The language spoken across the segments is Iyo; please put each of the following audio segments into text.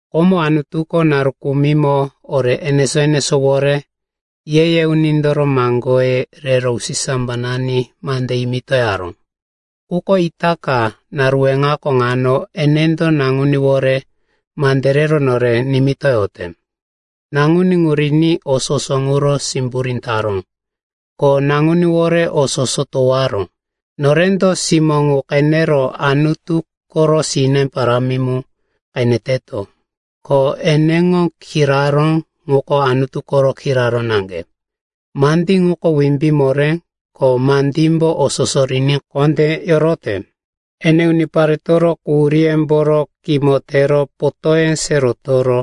Komo, Anutuko naru kumimo, ore enesó-enesówore, ye-ye unindoro maŋgoye rero usisambanani mande yimitoyaró. Quko itaka, naru weŋako ŋano, enendo Naŋuníwore mande rero nore nimitoyote. Naŋuní ŋu riní o soso ŋuro simburí taró, ko Naŋuníwore o soso towaró. Norendo simó ŋu qenero Anutu koro sine parámi mu qeneteto. Ko eneŋo kiraró ŋuko Anutu koro kiraró naŋge. Mandí ŋuko wimbí moré, ko mandímbo o soso riní kondé yorote. Ene uniparetoro quhuríyemboro kimo tero, potóye se rotoro,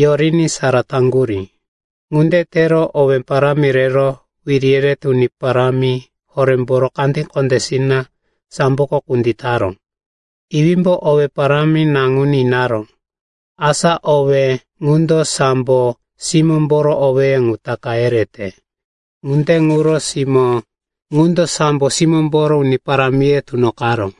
yoriní sara taŋgurí. Ŋunde tero owé parámi rero wiri yerete uni parámi horémboro kandí kondésina samboko kunditaró. Iwímbo owé parámi Naŋuní inaró. Asa owé ŋundo sambo simómboro owéye ŋu taka yerete. Ŋunde ŋuro simó ŋundo sambo simómboro uni parámiye tunoqaró.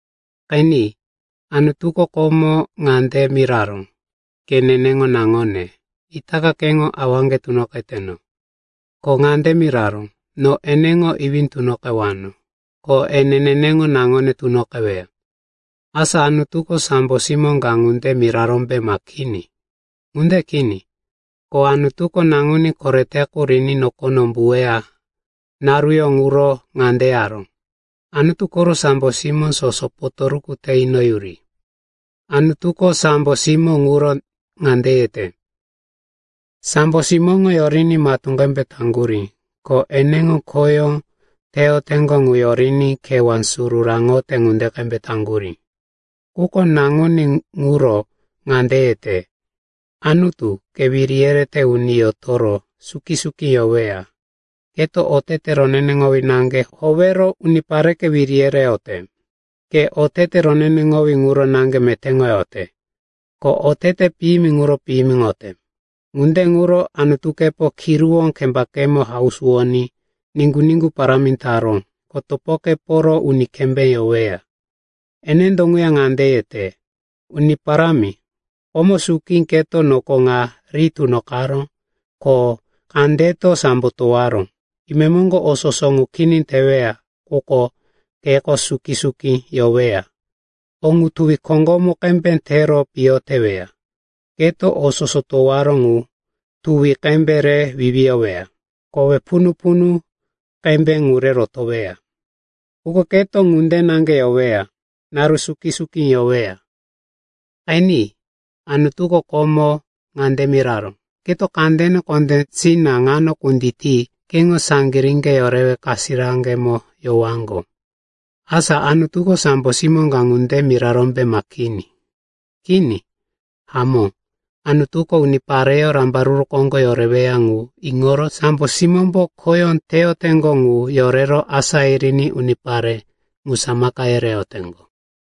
Qeni, Anutuko komo ŋande miraró, “Ke neneŋo naŋone, itaka keŋo awaŋge tunoqeteno,” ko ŋande miraró, “No eneŋo iwí tunoqewano, ko ene neneŋo naŋone tunoqeweya.” Asa, Anutuko sambo simó ka ŋunde mirarómbe ma kini? Ŋunde kini. Ko Anutuko naŋuní korete qu riní nokono umbuweya naruyó ŋuro ŋande yaró, “Anutu koro sambo simó soso potoruku te inoyuri.” Anutuko sambo simó ŋuro ŋande yete, “Sambo simóŋo yoriní matú qembe taŋgurí, ko eneŋo khoyó teyoteŋgo ŋu yoriní kewá suru raŋote ŋunde qembe taŋgurí.” Quko Naŋuní ŋuro ŋande yete, “Anutu, ke wiri yerete uni yotoro suki-suki yoweya. Keto otete roneneŋowí naŋge howero unipareke wiri yereyote. Ke otete roneneŋowí ŋuro naŋge metéŋoyote, ko otete piyimi ŋuro piyimiŋoyote. Ŋunde ŋuro Anutukepo kiruwó kembakemo hausuwoní niŋgu-niŋgu parámi taró, ko topokeporo uni kembé yoweya.” Enendo ŋuya ŋande yete, “Uni Parámi, komo suki keto noko ŋa ri tunoqaró, ko kandeto sambo towaró. Imemoŋgo o soso ŋu kini teweya, quko keko suki-suki yoweya, o ŋu tuwi koŋgomu qembe tero piyo teweya. Keto o soso towaró ŋu tuwi qembe re wiwiyoweya, kowe punu-punu qembe ŋu re rotoweya, quko keto ŋunde naŋge yoweya, naru suki-suki yoweya.” Qeni, Anutuko komo ŋande miraró, “Keto kandene kondésina ŋano kunditi keŋo saŋgiríŋge yorewe kasirakemo yowaŋgo.” Asa, Anutuko sambo simó ka ŋunde mirarómbe ma kini? Kini. Hamó, Anutuko unipareyó rambaruru koŋgo yoreweya ŋu iŋoro sambo simómbo khoyó teyoteŋgo ŋu yorero asá yiriní unipare ŋu samaka yereyoteŋgo.